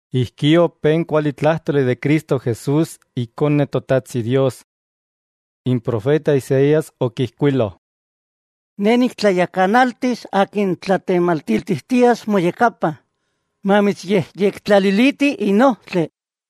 Ijkí opé n kualitlájtoli de Cristo Jesús Ikone Totajtsi Dios. N profeta Isaías okijkuilo: Ne niktlayakanaltis akin tlatematiltijtias moyakapa, mamitsyejyektlaliliti n ojtli.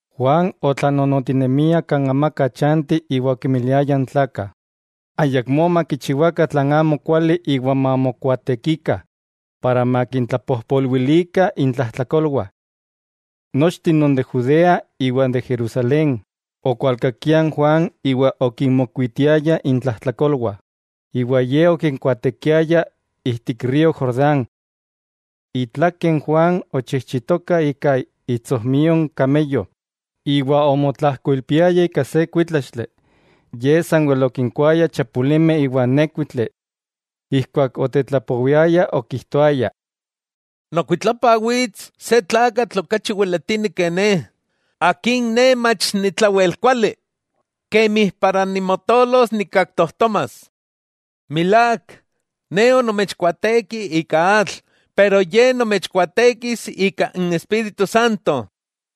Juan otlanonotinemia kan amaka chanti iwa okinmiliaya n tlakah ayakmó makichiwakah tlan amokuali iwa mamokuaatekikah, para makintlapojpolwilikah intlajtlakolwah. Nochteh non de Judea iwa de Jerusalén, okualkakiah n Juan iwa okinmokuitiayah intlajtlakolwah, iwa ye okinkuaatekiaya ijtik río Jordán. Itlake n Juan ochijchitoka ika itsojmio n de kameyo, iwa omotlajkoilpiaya ika se kuítlaxtli, ye sanwel okinkuaya chapulimeh iwa nékuitli. Ijkuak otetlapowiaya okijtoaya: —Nokuitlapa wits se tlakatl okachi weletini ke ne, Akin ne mach ni tlawel kuali kemi para nimotolos nikaktojtomas. Milák, ne onomechkuaateki ika atl, pero Ye nomechkuaatekis ika n Espíritu Santo.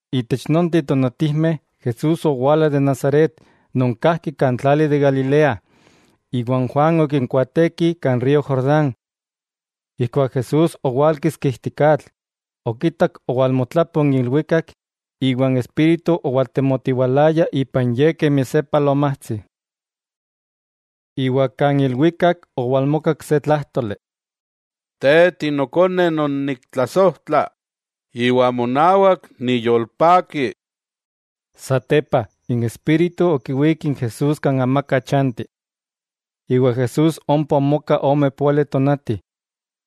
Itech nonteh tonatijmeh, Jesús owala de Nazaret, non kajki kan tlali de Galilea, iwa n Juan okikuaateki kan río Jordán. Ijkuak Jesús owálkiski ijtik atl, okitak owalmotlapo n ilwikak iwa n Espíritu owaltemotiwalaya ipan Ye kemi se palomatsi. Iwa kan ilwikak owalmokak se tlájtoli: —Te Tinokone non niktlasojtla, iwa monawak niyolpaki. Satepa n Espíritu okiwík n Jesús kan amaka chanti. Iwa Jesús ompa omoka ome póali tonati,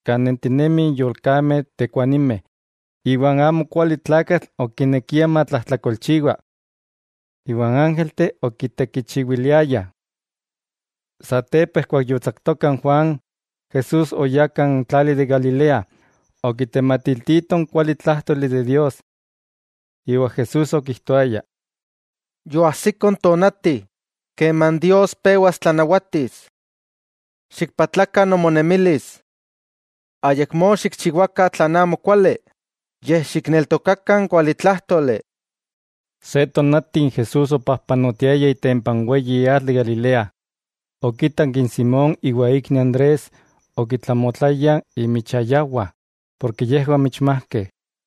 kan nentinemih n yolkameh tekuanimeh, iwa n amokualitlakatl okinekia matlajtlakolchiwa. Iwa n ángelteh okitekichiwiliayah. Satepa ijkuak yotsaktoka n Juan, Jesús oyá kan tlali de Galilea, okitematiltito n kualitlájtoli de Dios. Iwa Jesús okijtoaya: —Yoajsiko n tonati, keman Dios pewas tlanawatis. Xikpatlakah nomonemilis. Ayakmó xikchiwakah tlan amokuali, yej xikneltokakah n kualitlájtoli. Se tonati ijkuak Jesús opajpanotiaya itempa n weyi atl de Galilea, okitak n Simón iwa ikni Andrés okitlamotlayah inmichayawah porke yejwah michmajkeh.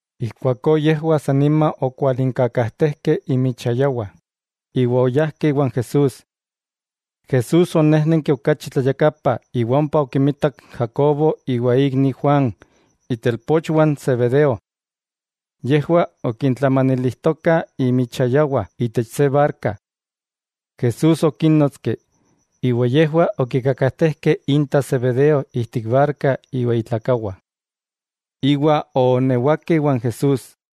Ijkuakó yejwah san nima okualinkakajtejkeh inmichayawah iwa oyajkeh iwan Jesús. Jesús onéjnenki okachi tlayakapa iwa ompa okimitak n Jacobo iwa ikni Juan, itelpochwah n Zebedeo. Yejwah okintlamanilijtokah inmichayawah itech se barka. Jesús okínnotski, iwa yejwah okikakajtejkeh inta Zebedeo ijtik barka iwa itlakawah, iwa oonewakeh iwan Jesús.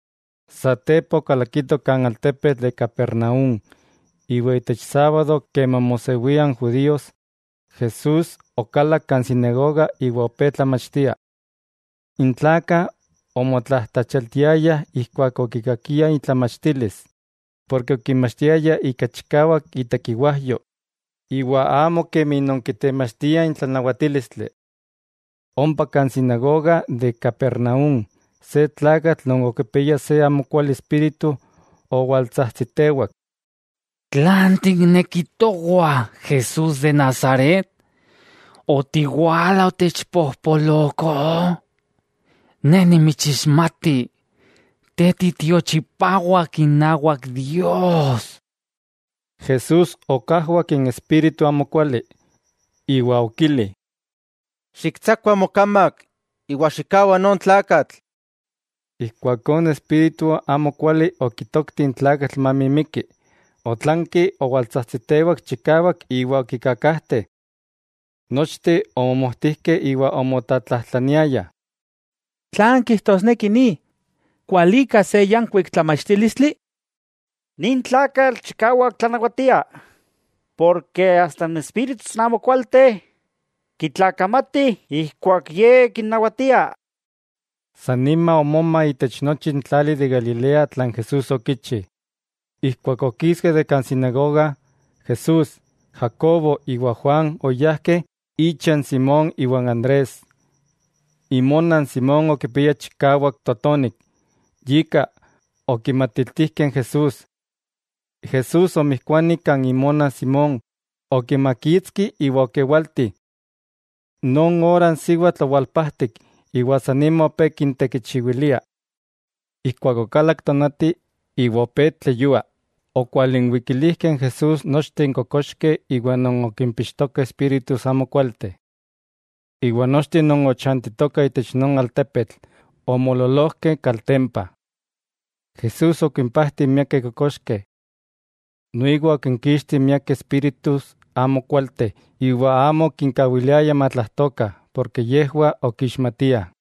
Satepa okalakitoh kan altepetl de Capernaúm, iwa itech sábado keman mosewia n judíos, Jesús okalak kan sinagoga iwa opé tlamachtia. N tlakah omotlajtlachialtiayah ijkuak okikakiah itlamachtilis, porke okinmachtiaya ika chikawak itekiwajyo, iwa amo kemi non kitemachtiah n tlanawatílistli. Ompa kan sinagoga de Capernaúm, se tlakatl non okipiaya se amokuali espíritu, owaltsajtsitewak: —¿Tlan tikneki towah, Jesús de Nazaret? ¿Otiwala otechpojpoloko? Ne nimitsixmati, Te titiochipawak inawak Dios. Jesús okajwak n espíritu amokuali, iwa okili: —¡Xiktsakua mokamak iwa xikkawa non tlakatl! Ijkuakó n espíritu amokuali okitokti n tlakatl mamimiki, otlanki owaltsajtsitewak chikawak iwa okikakajte. Nochteh omomojtijkeh iwa omotlatlajtlaniayah: —¿Tlan kijtosneki ni? ¿Kualika se yankuik tlamachtílistli? ¡Nin tlakatl chikawak tlanawatia porke asta n espíritus amokualteh, kitlakamatih ijkuak Ye kinnawatia! San nima omoma itech nochi n tlali de Galilea tlan Jesúsokichi. Ijkuak okiskeh de kan sinagoga, Jesús, Jacobo iwa Juan oyajkeh icha n Simón iwa n Andrés. Imona n Simón okipiaya chikawak totonik, yika, okimatiltijkeh n Jesús. Jesús oonmijkuani kan imona n Simón, okimakitski iwa okewalti. Non ora n siwatl owalpajtik, iwa san nima opé kintekichiwilia. Ijkuak okalak tonati iwa opé tleyua, okwalinwikilijkeh n Jesús nochteh n kokoxkeh iwa non okimpixtokah espíritus amokualteh. Iwa nochteh non ochantitokah itech non altepetl, omoololojkeh kaltempa. Jesús okimpajtih miakeh kokoxkeh. Noiwa okinkixti miakeh espíritus amokualteh iwa amo okinkawiliaya matlajtokah, porke yejwah okixmatiah.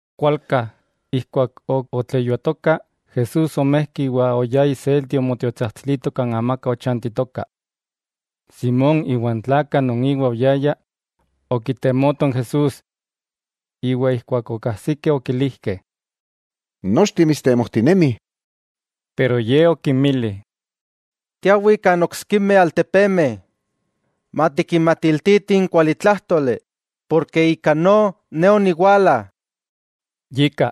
Kualka, ijkuak ok otleyuatoka, Jesús omejki iwa oyá iselti omotiotsajtsilito kan amaka ochantitoka. Simón iwa n tlakah non inwah oyayah, okitemotoh n Jesús. Iwa ijkuak okajsikeh okilijkeh: —Nochteh mitstemojtinemih. Pero Ye okinmili: —Tiawih kan oksikimeh altepemeh, matikinmatiltitih n kualitlájtoli, porke ika no, Ne oniwala. Yika,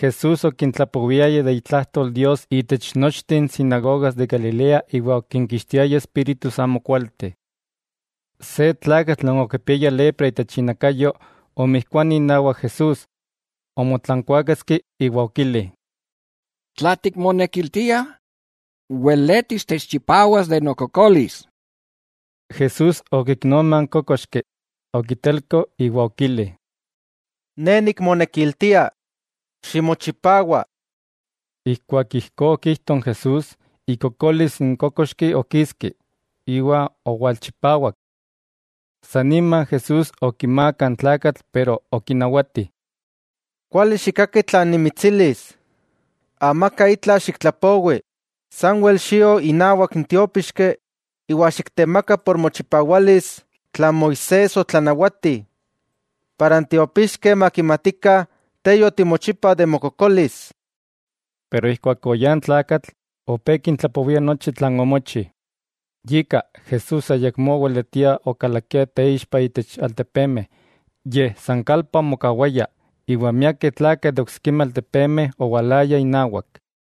Jesús okintlapowiaya de itlajtol Dios itech nochteh n sinagogas de Galilea iwa okinkixtiaya espíritus amokualteh. Se tlakatl non okipiaya lepra itech inakayo omijkuani inawak Jesús, omotlankuáketski iwa okili: —Tla tikmonekiltia weletis techchipawas de nokokolis. Jesús okiknoma n kókoxki, okitelko iwa okili: —Ne nikmonekiltia. ¡Ximochipawa! Ijkuak ijkó okijto n Jesús, ikokolis n kókoxki okiski, iwa owalchipawak. Sanima Jesús okimaaka n tlakatl pero okinawati: —Kuali xikkaki tlan nimitsilis, amaka itla xiktlapowi, sanwel xio inawak n tiópixki, iwa xiktemaka por mochipawalis tlan Moisés otlanawati, para n tiopixkeh makimatikah te yotimochipa de mokokolis. Pero ijkuak oyá n tlakatl, opé kintlapowia nochi tlan omochi. Yika, Jesús ayakmó oweletia okalakia teixpa itech altepemeh, yej san kalpa omokawaya, iwa miakeh tlakah de oksikimeh altepemeh owalayah inawak.